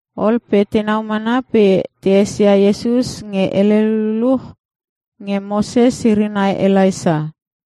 Ol pe tenau mana pe te esia Iesus nge hele lululuch nge Moses iri nai Elaisa.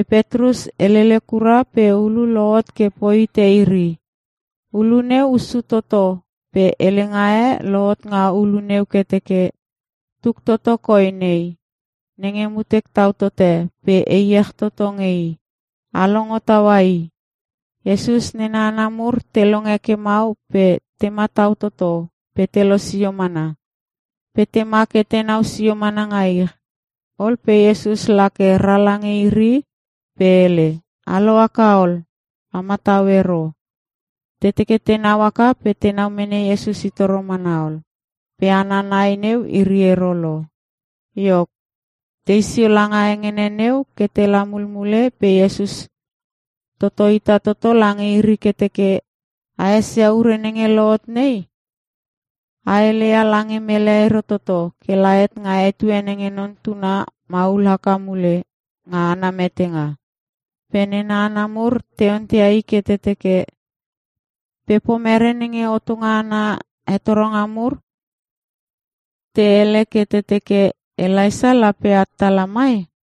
Petrus helele kura pe ulu lohot ke poi hite iri. Ulu neu hussu toto pe helenga e lohot nga ulu neu ke teke, “Tuk toto koi nei, nenge mutek tau tote pe e iech toto nge I. A longo taua I!” Iesus nena hana mur te longe ke mau pe te matau toto pe te losio mana. Pe tema ke tenau sio mana nga ich. Ol pe Iesus la ke ra lange iri pe hele, “A lohaka ol. A matau ero.” Te teke tenau haka pe tenau mene Iesus i toro mana ol. Pe hana nai neu iri ero lo. Iok, tei sio nga hengene neu ke tela mulmule pe Iesus toto hita toto lange iri ke teke, “A esia ure nenge lohot nei, a hele ia lange mele ero toto kela het nga etue nenge Non Tuna maul haka mule nga ana metenga.” Pe nena hana mur te onteia I ke te teke, “Pe pomere nenge hotonga ana hetoronga mur te hele ke te teke, Elaisa lape at tala mai?”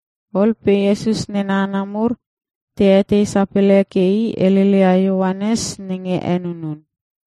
Ol pe Iesus nena hana mur te etei sapele ke I heleleia Ioanes nenge Henunun.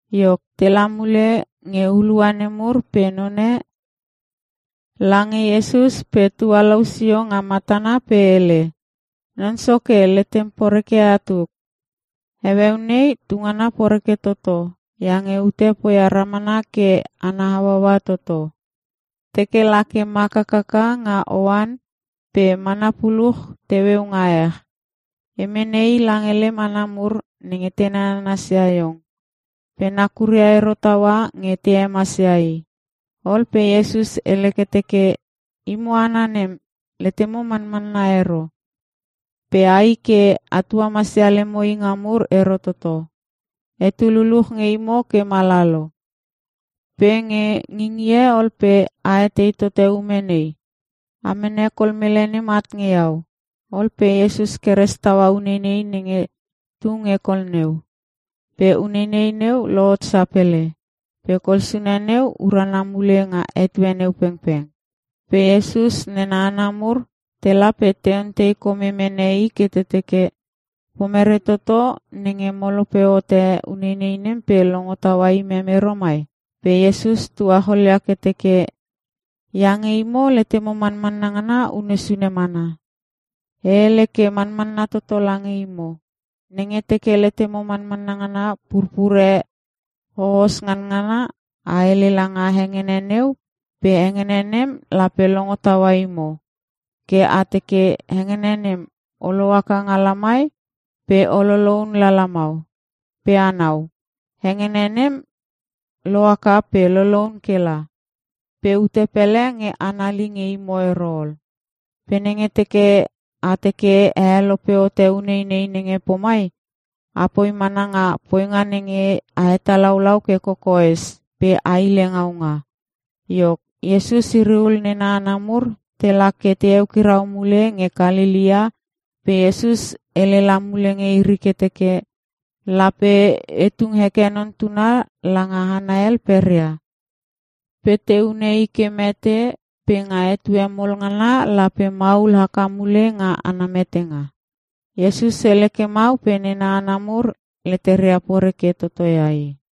Iok, tela mule nge hulua nemur pe none lange Iesus pe tualou sio nga matana pe hele, “Non Soke, letem poreke ia tuk. Heueu nei tungana poreke toto iange ute poia ramana ke ana hauaua toto. Teke la ke mak hakaka nga oan pe mana puluch teueu nga ech. E mene i lange lem hana mur nenge te nananasia iong, pe nakuria ero taua nge te hemasia i.” Ol pe Iesus hele ke teke, “Imo hana nem, letemo manmanna ero, pe ai ke a tuamasia lemo inga mur ero toto. Etu luluch nge imo ke mala lo. Pe nge ngingie ol pe a etei tote ume nei? A mene kol nem at nge Iau.” Ol pe Iesus keres taua uneinei nenge tu nge kol neu, pe uneinei neu lohot sapele. Pe kol sune neu urana mule nga etue neu pengpeng. Pe Iesus nena hana mur tela pe te ontei kome mene I ke teke, “Pomerei toto nenge mo helope hote uneinei nem pe longo taua imem ero mai?” Pe Iesus tuacholia ke teke, “Iange imo letemo manmanna ngana unne sune mana. E hele ke manmanna toto lange imo. Nenge teke letemo manmanna ngana purpure hohos nganngana, a hele langa hengene neu pe hengene nem lape longo taua imo. Ke a teke, ‘Hengene nem, o lohaka nga lamai pe o loloun la lamau.’ Pe anau, hengene nem lo haka pe loloun ke la. Pe ute pele nge anali nge imo ero ol. [ Pe nenge teke a teke a helope hote uneinei nenge pomai, apoi mana nga poinga nenge a hetalaulau ke kokoes pe a hile ngaunga.”] Iok, Iesus iri ul nena hana mur tela ke te eukirau mule nge Kalelea pe Iesus hele la mule nge iri ke teke, “Lape te tung heke Non Tuna langa hana hel peria. Pe te hune I ke mete pe nga etue mol ngana lape maul haka mule nga ana metenga.” Iesus hele ke mau pe nena hana mur leteria poreke toto ia I.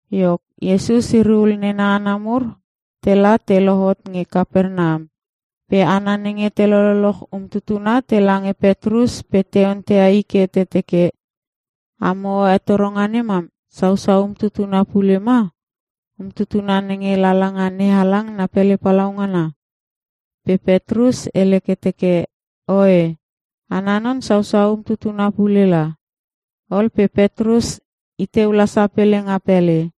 Iok, Iesus iri ul nena hana mur tela te lohot nge Kapernam pe hana nenge te lololoch umtutuna tela nge Petrus pe te onteia i ke te teke, “Amo hetoronga nem mam sausau umtutuna pule ma? Umtutuna nenge lala nga NeHalang na pele palaungana?” Pe Petrus hele ke teke, “Oe, Ana non sausau umtutuna pule la.” Ol pe Petrus i teu la sapele nga pele.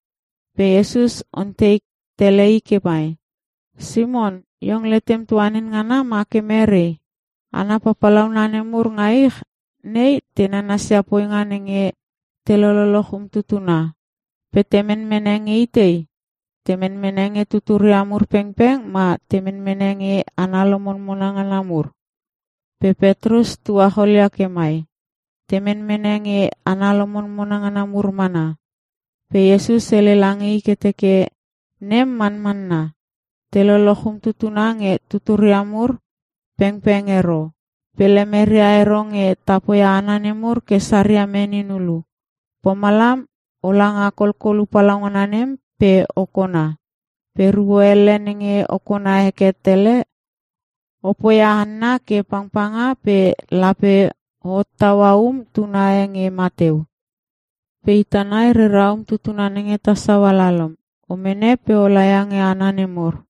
Pe Iesus ontei tele i ke mai, “Simon, iong letem tuanin ngana ma ke mere? Hana papalauna nemur nga ich nei te nananasia poinga nenge te lololoch umtutuna. Pe te menmene nge itei? Te menmene nge tuturia mur pengpeng ma te menmene nge hana lomonmona ngana mur?” Pe Petrus tuacholia ke mai, “Te menmene nge hana lomonmona ngana mur mana.” Pe Iesus hele lange i ke teke, “Nem manmanna. Te loloch umtutuna nge tuturia mur pengpeng ero. Pe lemere ero nge ta poia hana nemur ke saria menin hulu. Pomalam o la nga kolkolu palaungana nem pe o kona. Pe ruo elle nenge o kona heke tele, o poia hanna ke pangpanga pe lape o hottaua um tuna e nge mateu. Pe ita nai rera umtuna nenge ta saua lalom. O mene pe o laia nge hana nemur.”